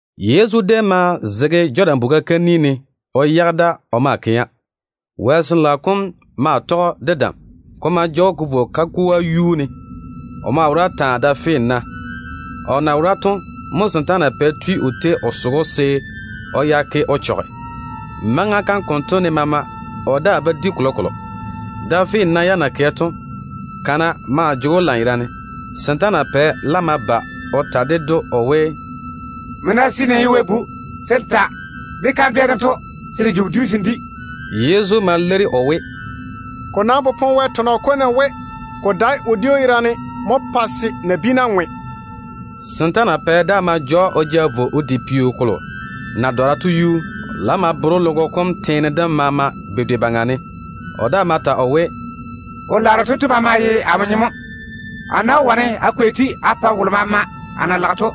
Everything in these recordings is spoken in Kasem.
Yezu déem ma zege Jɔdan buga kam ni ne o yage da o maa kɛa. Wɛ Sin-laao kom maa tɔge‑o de dam. Ko ma ja‑o ko vo kagoa yuu ne. O maa wora taa, da finna. O na wora to mo setaana pɛ tui o tei o soge‑o se o ya ke o chɔge. Maŋa kam konto ne maama, o daa ba di kolokolo. Da finna yam na kɛ to, kana maa jege‑o lanyerane. Setaana pɛ laam ma ba o ta ded‑o o we, “Nmo ná seene n ye Wɛ Bu, se n ta de kandwɛ dento se de ji wodiu se n di.” Yezu ma leiri o we, “Ko nam popone Wɛ tɔnɔ kom ne we: ‘Ko dae wodiu yerane mo pae se nabiina ŋwe.’” Setaana pɛ daa ma ja‑o o ja vo o di peo kolo na dɔra to yuu. O laam ma bere‑o logo kom teene dem maama bedwe baŋa ne. O daa ma ta o we, “Wo-laaro tento maama ye amo nyem mo. A nam wó wane a kwei-te a pa wolo maama a na lage to.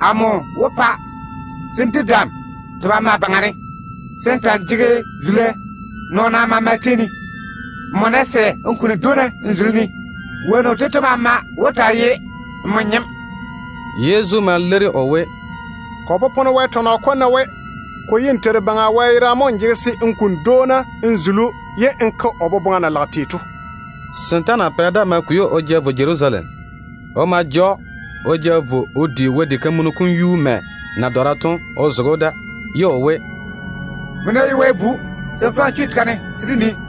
Amo wó pa se n di dam te maama baŋa ne, se n ta‑n jege zula nɔɔna maama tei ne. Nmo ná sɛ n kuni dwoona n zuli-ne, wonnu tento maama wó taa ye nmo nyem.” Yezu ma leiri o we, “Ko popone Wɛ tɔnɔ kom ne we: ‘Ko ye n Teiru Baŋa Wɛ yerane mo n jege se n kuni dwoona n zuli‑o, ye n toŋe n ke o boboŋa.’” Setaana pɛ daa ma kwei‑o o ja vo Jerusalem. O ma ja‑o o vo o di Wɛ diga kam yuu mɛ na dɔra to o zege‑o da, ye o we, “Nmo ná ye Wɛ Bu, se n faŋe n chu tega ne se dé nii.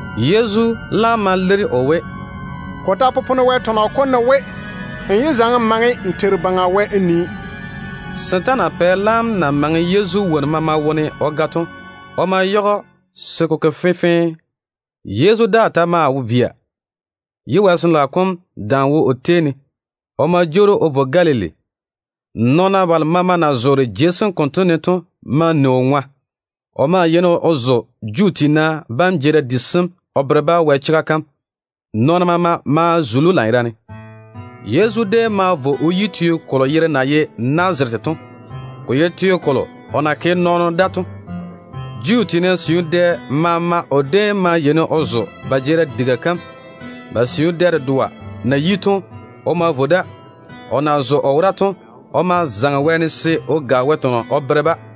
Yezu laam ma leiri o we, “Ko ta popone Wɛ tɔnɔ kom ne we: ‘N yé faŋe n Teiru Baŋa Wɛ n nii.’” Setaana pɛ laam na maŋe Yezu wonnu maama wone o ga to, o ma yage‑o se ko ke fenfee. Yezu daa ta maa via, ye Wɛ Sin-laao kom dam wo o tei ne. O ma jwoori o vo Galili. Nɔɔna balo maama na zoore jei sem konto ne to ma ni o ŋwa. O ma yeini o zo Juu tiina jeerim di sem o bere-ba Wɛ chega kam. Nɔɔna maama maa zuli‑o lanyerane. Yezu déem ma vo o yi teo kolo yere na ye Nazarete to. Ko ye teo kolo o na ke nɔɔno da to. Juu tiina siu dɛ maama o déem ma yeini o zo ba jeerim diga kam. Ba siu dɛ dedoa na yi to, o ma vo da. O na zo o wora to, o ma zaŋe wɛɛne se o ga Wɛ tɔnɔ o bere-ba.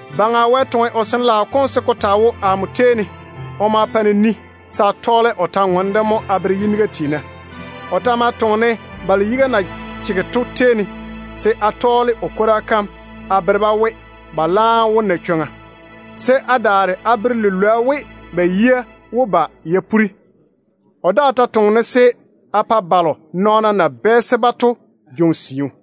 “Baŋa Wɛ Sin-laao kom mo wo amo baŋa ne. Kokuri to, o tiŋi-ne mo se a tɔɔle o kwor-ywoŋa kam a bere yiniga tiina. O ta ma toŋe-ne balo yiga na chege to tei ne, se a tɔɔle o kwora kam a bere-ba we ba laam wó taa tei ba tete, se a daare a bere lilwoa we ba yia wó ba ya puri. O daa ta toŋe-ne se a pa balo nɔɔna na bɛɛse-ba to jwoŋi siu,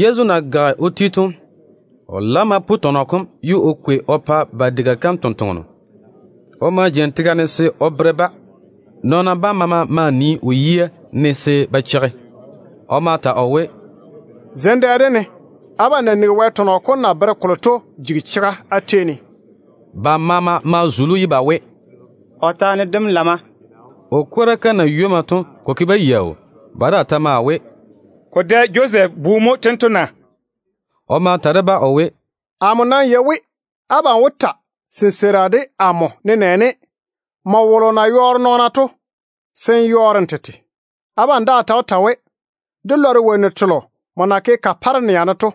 Yezu na gage o ti to, o laam ma pu tɔnɔ kom ye o kwei o pa ba diga kam tontoŋeno. O ma jeini tega ne se o bere-ba. Nɔɔna bam maama maa nii o yia ne se ba cheigi. O ma ta o we, “Zem dɛ dem ne, abam na nigi Wɛ tɔnɔ kom na bere kolo to jigi chega á tei ne.” Ba maama maa zuli‑o ye ba we, “O taane dem lamma.” O kwora kam na ywomma to, ko ke-ba yaau. Ba daa ta maa we, “Ko dae Josɛf bu mo tento na?” O ma ta de-ba o we, “Amo nam yei we abam wó ta sinseira de amo nenɛɛne, ‘Nmo wolo na yɔɔre nɔɔna to, se n yɔɔre n tete!’ Abam daa ta wó ta we, ‘Dé lɔre wonnu telo nmo na ke Kaparenia ne to.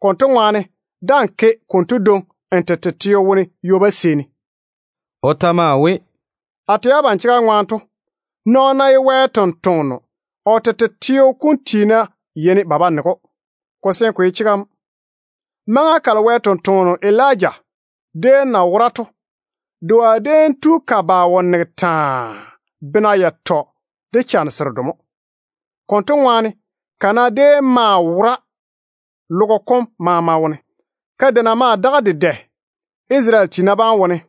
Konto ŋwaane daa‑n ke konto dwoŋi n tete teo wone ywoba seeni.’” O ta ma ta o we, “A tɛ abam chega ŋwaane to, nɔɔno ná ye Wɛ ni-jwoŋinu, o tete teo kom tiina yeini ba ba nege‑o. Ko seene ko ye chega mo. Maŋa kalo Wɛ sampwora Elija déem na wora to, doa déem tu ka ba ka wo nege taa, bena yatɔ de chane seredo mo. Konto ŋwaane da-kore déem zege ka maŋa ne pa kana wora logo kom maama wone. Kadeina maa daga dedɛ Isarele tiina bam wone,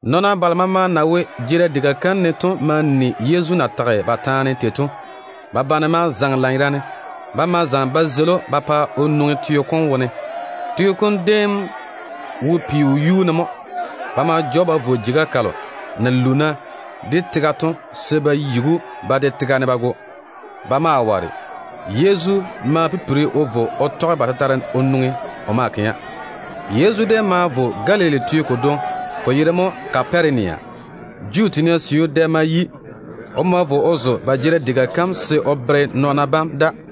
Nɔɔna balo maama na wo jeerim diga kam ne to na nigi Yezu na tage kolo to, ba bane ma zaŋe lanyerane. Ba ma zaŋe ba zeili‑o ba pa o nwoŋi teo kom wone. Teo kom déem wo peo yuu ne mo. Ba ma ja‑o ba vo jeiga kalo na luuna de tega to se ba yigi‑o ba de tega ne ba go. Ba ma ware. Yezu ma pipiri o vo o tɔge ba tetare o nwoŋi o maa kɛa. Yezu déem ma vo Galili teo kodwoŋi, ko yere mo Kaparenia. Juu tiina siu dɛ ma yi. O ma vo o zo ba jeerim diga kam se o bere nɔɔna bam da.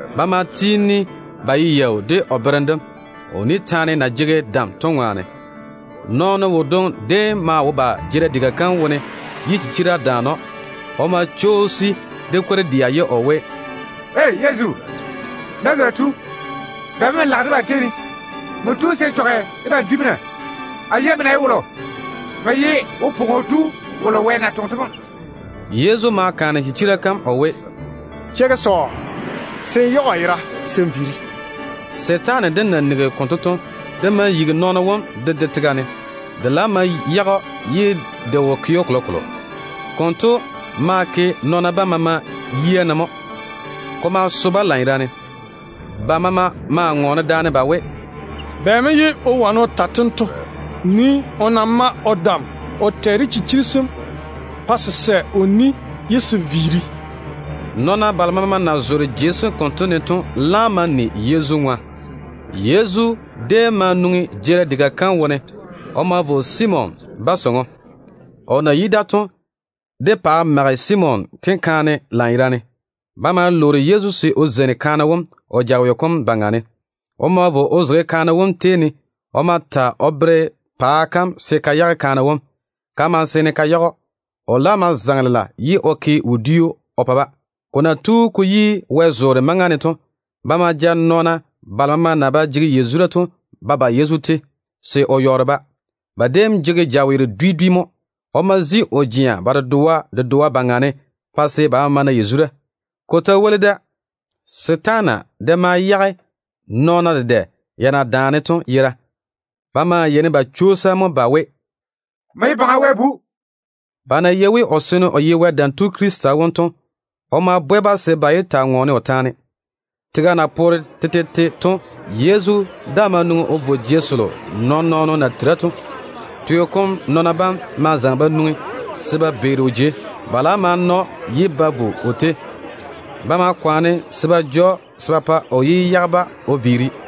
Ba maa tiini ba ye yaau de o berem dem, o ni taane na jege dam to ŋwaane. Nɔɔno wodwoŋi déem maa wo ba jeerim diga kam wone ye chichira daane‑o. O ma chwoosi de kwor-dɛa ye o we, “Woo! Yezu, Nazarete tu, bɛ mo n lage debam tei ne? Nmo tu se n chɔge debam dwi mo na? A nam yei nmo na ye wolo. Nmo ye Wo-pwoŋo Tu wolo Wɛ na toŋe to mo.” Yezu ma bwɛ chichira kam o we, “Cheigi sɔɔ, se n yage o yera se n viiri.” Setaane dem na nigi konto to, de ma yigi nɔɔno wom de de tega ne. De laam ma yage‑o ye de wo ke‑o kolokolo. Konto ma ke nɔɔna bam maama yia ne mo. Ko ma so-ba lanyerane. Ba maama maa ŋɔɔne daane ba we, “Bɛ mo ye o wane o ta tento? Nii o na mae o dam o tɛ de chichiri sem pa se se sɛ o ni ye se viiri.” Nɔɔna balo maama na zoore jei sem konto ne to laam ma ni Yezu ŋwa. Yezu déem ma nwoŋi jeerim diga kam wone. O ma vo Simon ba sɔŋɔ. O na yi da to, de paa mage Simon tenkaane lanyerane. Ba ma lwoori Yezu se o zeini kaane wom o jaweo kom baŋa ne. O ma vo o zege kaane wom tei ne. O ma ta o bere paa kam se ka yage kaane wom. Ka ma seene ka yage‑o. O laam ma zaŋe lela ye o ke wodiu o pa-ba. Ko na tu ko yi wɛ-zoore maŋa ne to, ba ma ja nɔɔna balo maama na ba jege yazura to ba ba Yezu tei se o yɔɔre-ba. Ba déem jege jaweero dwi dwi mo. O ma zi o jea ba dedoa dedoa baŋa ne pa se ba maama na yazura. Ko ta woli da, setaana de ma yage nɔɔna dedɛ ya na jege ya daane to yera. Ba maa yeini ba chwoosa mo ba we, “Nmo ye Wɛ Bu wom!” Ba nam na yei we o seene o ye Wɛ Dam Tu Krista wom to, o ma bwɛ-ba se ba daa yé taa ŋɔɔne o taane. Tega na poore tetete to Yezu daa ma nwoŋi o vo jei selo nɔɔn-nɔɔno na tera to. Teo kom nɔɔna bam ma zaŋe ba nwoŋi se ba beeri o jei. Ba laam ma na‑o ye ba vo o tei. Ba ma kwaane se ba che o chwoŋa se o yé viiri o yage-ba.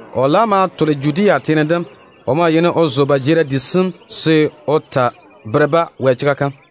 O laam maa tole Judea teene dem. O déem yeini o zo ba jeerim di sem mo se o taa bere-ba Wɛ chega kam.